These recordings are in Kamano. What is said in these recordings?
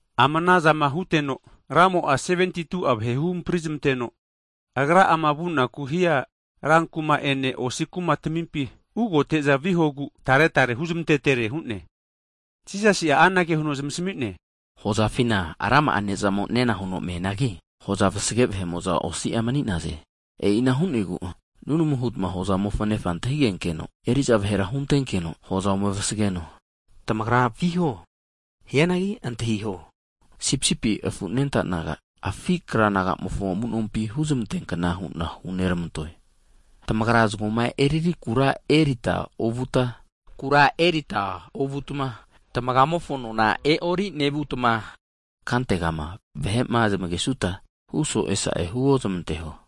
Ama anazama huteno, Ramo'a 72'a vahe huhampri zmanteno, Agra'ama vunaku'ma hia rankuma ene maka osi kuma tamimpi, ugote'za vihogu tare tare huzmantetere hu'ne. Jisasi'a anage huno zmasami'ne, hozafina rama'a ne'zamo'a nena huno meanagi, hoza vasage vahe'mo'za osi'a mani'naze. E'ina hu'negu nunamu hutma hozamofo Nefa antahigenkeno, eriza vahera huntenkeno hoza ome vasageno. Tamagra viho! Hianagi antahiho, sipsipi afu anenta naga, afi' kra nagamofo amunompi huzmanteankna hu'na huneramantoe. Tamagra zagoma eriri kura erita ovutma, kura erita ovutma, tmagamofo anona e'ori nevutma, kantegama vahe'ma zmagesuta huso'e sa'e huo zmanteho.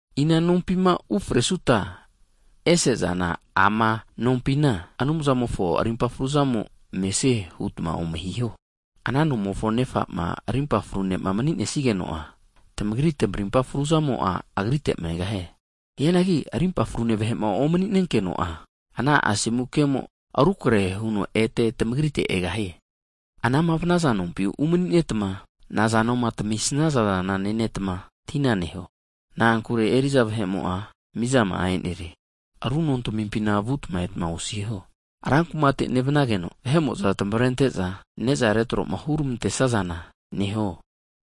Ina nompima ufresuta ese'zana ama nompina, Anumzamofo rimpa fruzamo mesie hutma ome hiho. Ana nomofo nefama rimpa fru ne'ma mni'nesnigeno'a, tamagri tamarimpa fruzamo'a, agrite megahie. Hianagi rimpa frune vahe'ma omni'nenkeno'a, ana asomu kemo rukrehe huno ete tamagrite egahie. Anama vnaza nompi umaninetma nazanoma tamisazana nenetma tina neho. Na'ankure eriza vahe'mo'a mizama'a e'nerie. Ru nontamimpina vutma etma osiho. Rankumate nevnageno vahe'mo'za tamavrente'za, neza retroma huramantesa zana neho.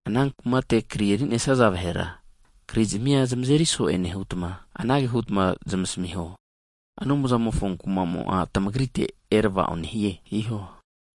Ana kumate kri erinesaza vahera krizmia zmazeri so'e nehutma, anage hutma zmasamiho. Anumzamofo kumamo'a tmagrite erava'o nehie hiho!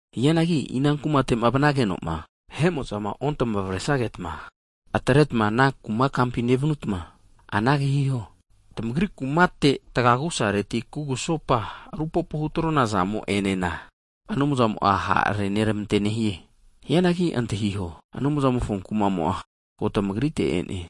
Hianagi ina kumatema vnagenoma vahe'mo'za otamavresagetma, atretma ana kuma kampi nevanutma anage hiho. Tamagri kumate kugusopa tagia agusareti rupopo hutrona zamo'enena, Anumzamo'a ha' renermante nehie. Hianagi antahiho, Anumzamofo kumamo'a ko tamagrite e'ne.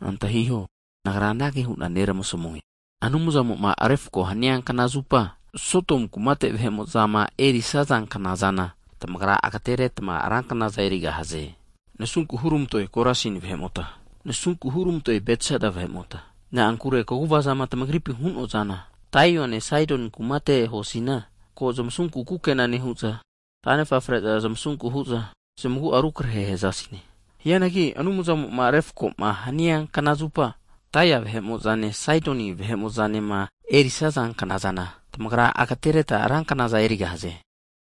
Antahiho, Nagra anage hu'na neramasamue. Anumzamo'ma refko hania knazupa, Sodomu kumate vahe'mo'zama erisaza knazana, tamagra ageteretma ra knaza erigahaze. Nasunku hurmantoe Korasin vahe'mota! Nasunku hurmantoe Betsaida vahe'mota! Na'ankure kaguvazama tamagripi hu'noazana, Taiane Saidoni kumate huasina, ko zmasunku kukena nehu'za, tanefa fre'za zmasunku hu'za zmagua'a rukrehe hazasine. Hianagi Anumzamoma vahema refkoma hania knazupa, Taia vahe'mo'zane Saidoni vahe'mozanema erisaza knazana, tamagra agatereta ranknaza erigahaze.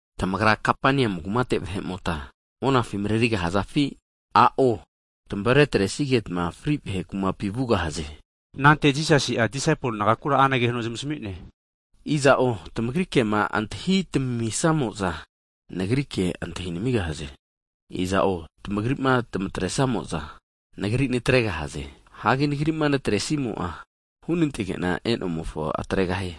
Tamagra Kapaniamu kumate vahe'mota monafi marerigahazafi? A'o, tamavretresigetma fri vahe kumapi (Hedes) vugahaze. Anante Jisasi'a disaipol nagakura anage huno zmasamine, Iza'o tamagri kema antahi tamamisamo'za, Nagri ke antahi namigahaze. Iza'o tamagrima tmatresamo'za Nagri natregahaze. Hagi Nagrima natresimo'a hunantege'na e'nomofo atregahie.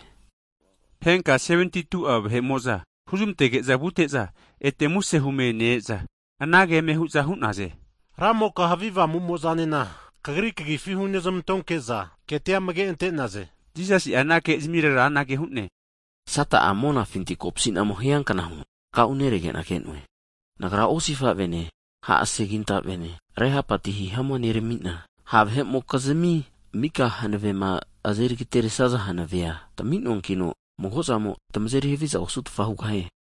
Henka 72'a vahe'mo'za huzmantege'za vute'za ete muse hume ne-eza, anage eme hu'naze. Ramoka havi avamumo'zanena Kagri kagifi hunezmantonke'za ketia amage ante'naze! Jisasi'a ana kezmirera anage hu'ne, Sata'a monafinti kopsinamo hiankna huno takauneregena ke'noe! Antahiho, Nagra osifavene ha' segintavene, rehapati hihamua neramina, ha' vahe'mokizmi mika hanavema azeri ageteresaza hanavea tami'noankino, mago'zamo tmazeri haviza osutfa hugahie.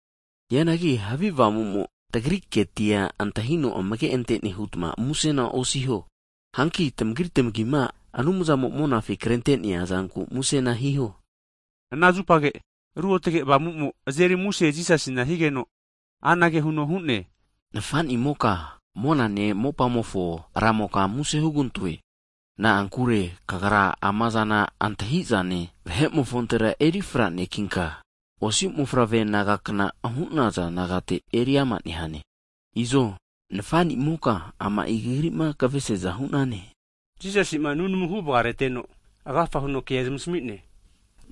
Hianagi havi avamumo tagri ketia antahino amage antene hutma musena osiho. Hanki tamagri tmagima Anumzamo'ma monafi krente'neazanku musena hiho. Ana zupage, Ruotge Avamumo azeri muse Jisasina higeno, anage huno hu'ne. Nafanimoka monane mopamofo Ramoka susu huna muse hugantoe. Na'ankure kagra amazama antahizane vahe'mofontera erifra nekinka, osi mofavre nagakna hu'naza nagate eri ama nehane. Izo, Nafanimoka ama'i kagrima kavesiaza hu'nane. Jisasi'ma nunamu huvgamareteno agafa huno kea zmasami'ne.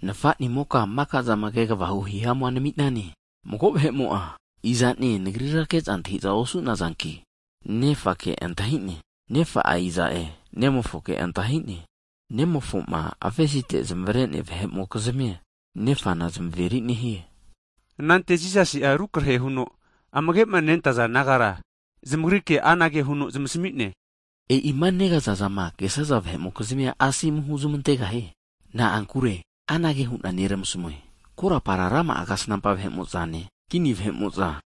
Nafanimo makazana kegvahu hihamu namine. Mago vahe'mo'a, izane Nagrira ke'za antahiza osu'nazanki, Nefake antahine, Nefa'a iza'e, Nemofoke antahine. Nemofo'ma avesite zmavrea vahe'mokizmia, Nefana zamaveri nehie. Anante Jisasi'a rukrehe huno amage'ma nentaza disaipol nagara zamagrike anage huno zmasami'ne, e'ima negazazama kesaza vahe'mokizmia asomu huzmantegahie. Na'ankure anage hu'na neramasamue, korapara rama'a kasnampa vahe'mo'zane, kini vahe'mo'za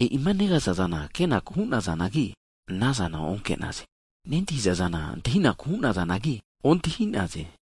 e'ima negaza'zana kenaku hunazanagi, anazana oke'naze. Nentahizaza antahinaku hu'nazanagi ontahi'naze.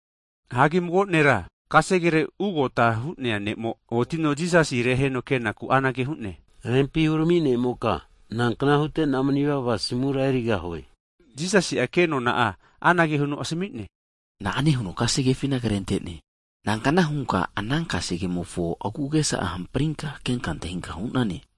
Hagi mago ne'ra kasegere ugota hu'nea ne'mo otino, Jisasi reheno kenaku anage hu'ne. Rempi hurami nemoka, nankna hutena manivava asimura erigahue? Jisasi'a kenona'a anage huno asmine, Na'ane huno kasegefina krentene? Nankna hunka ana kasegemofo agu'agesa hamprinka kenka antahinka hunane?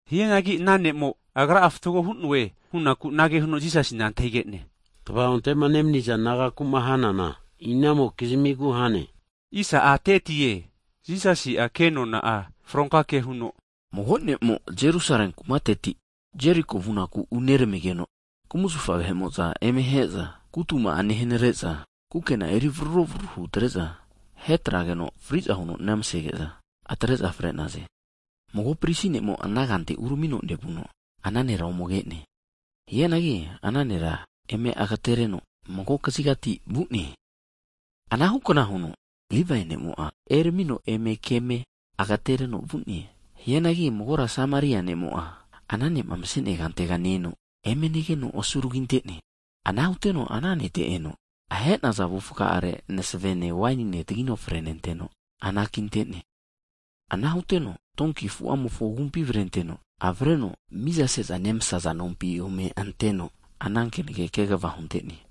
Hianagi ana ne'mo, agra'a fatgo hu'noe hunaku anage huno Jisasina antahigene, tvaonte'ma nemniza nagakuma hanana inamokizmigu hane? Jisasi' kenona'a fronka ke huno, Mago ne'mo Jerusale kumateti Jeriko vunaku uneramigeno, kumzafa vahe'mo'za eme ahe'za kutuma'a nehanare'za, kukena'a eri vroro hutre'za ahetrageno fri'za huno nemasege'za, atre'za fre'naze. Mago prisi ne'mo ana kante uramino nevuno ana nera ome ke'ne. Hianagi ana nera eme agatereno magokazigati vu'ne. Anahu kna huno Livae ne'mo'a eramino, eme keme agatereno vu'ne. Hianagi magora Sameria ne'mo'a ana ne'ma masenea kantega ne-eno, eme negeno asuragi ante'ne. Ana huteno ana nete eno, ahenaza avufga'are, masavene wainine tagino frenenteno anakintene. Ana huteno donki afu'amofo agumpi avrenteno, avreno miza seza nemasaza nompi ome anteno, ana kenege kegva hunte'ne.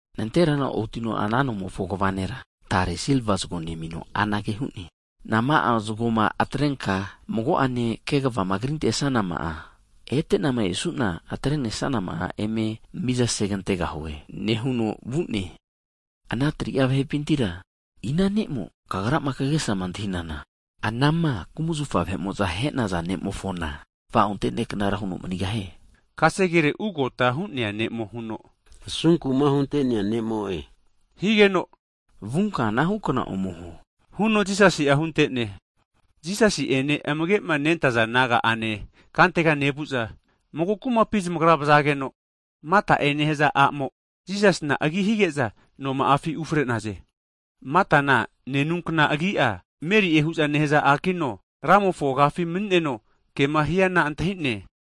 Nanterana otino ana nomofo kva nera, tare silva zago nemino anage hu'ne. Nama'a zagoma atrenka mago'ane kegavama krintesanama'a, etenama esu'na atrenesanama'a eme miza segantegahue nehuno vu'ne. Ana 3'a vahepintira ina ne'mo kagrama kagesama antahinana, anama kumazafa vahe'mo'za ahe'naza ne'mofona tva'onte neknara huno manigahie? Kasegere ugota hu'nea ne'mo huno, asunkuma hunte'nea ne'mo'e higeno, vunka anahukna ome huo huno Jisasi'a hunte'ne. Jisasi'ene amage'ma nentaza disipol naga'ane kantega nevu'za, mago kumapi zamagra vazageno, Mata'e nehaza a'mo Jisasina agi hige'za noma'afi ufre'naze. Matana nenunkna agi'a Meri'e hu'za nehaza a'kino, Ramofo agafi mani'neno, kema hiana antahine.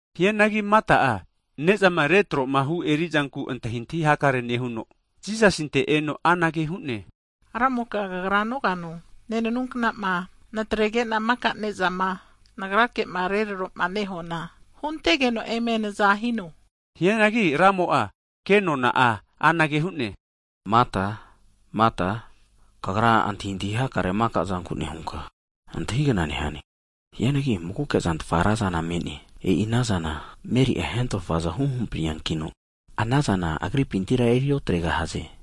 Hianagi Mata'a ne'zama retromahu erizanku antahintahi hakare nehuno, Jisasinte eno anage hu'ne. Ramoka kagra nogano, nenanuknama natregena maka nezama nagrake'ma retroma nehuana? Huntegeno eme naza hino. Hianagi Ramo'a, kenona'a anage hu'ne, Mata, Mata, kagra antahintahi hakare maka'zanku nehunka antahigna nehane. Hianagi magoke'zantfa razana me'ne, e'i anazana Meri'a hentofaza huhampriankino, anazana agripintira eri otregahaze.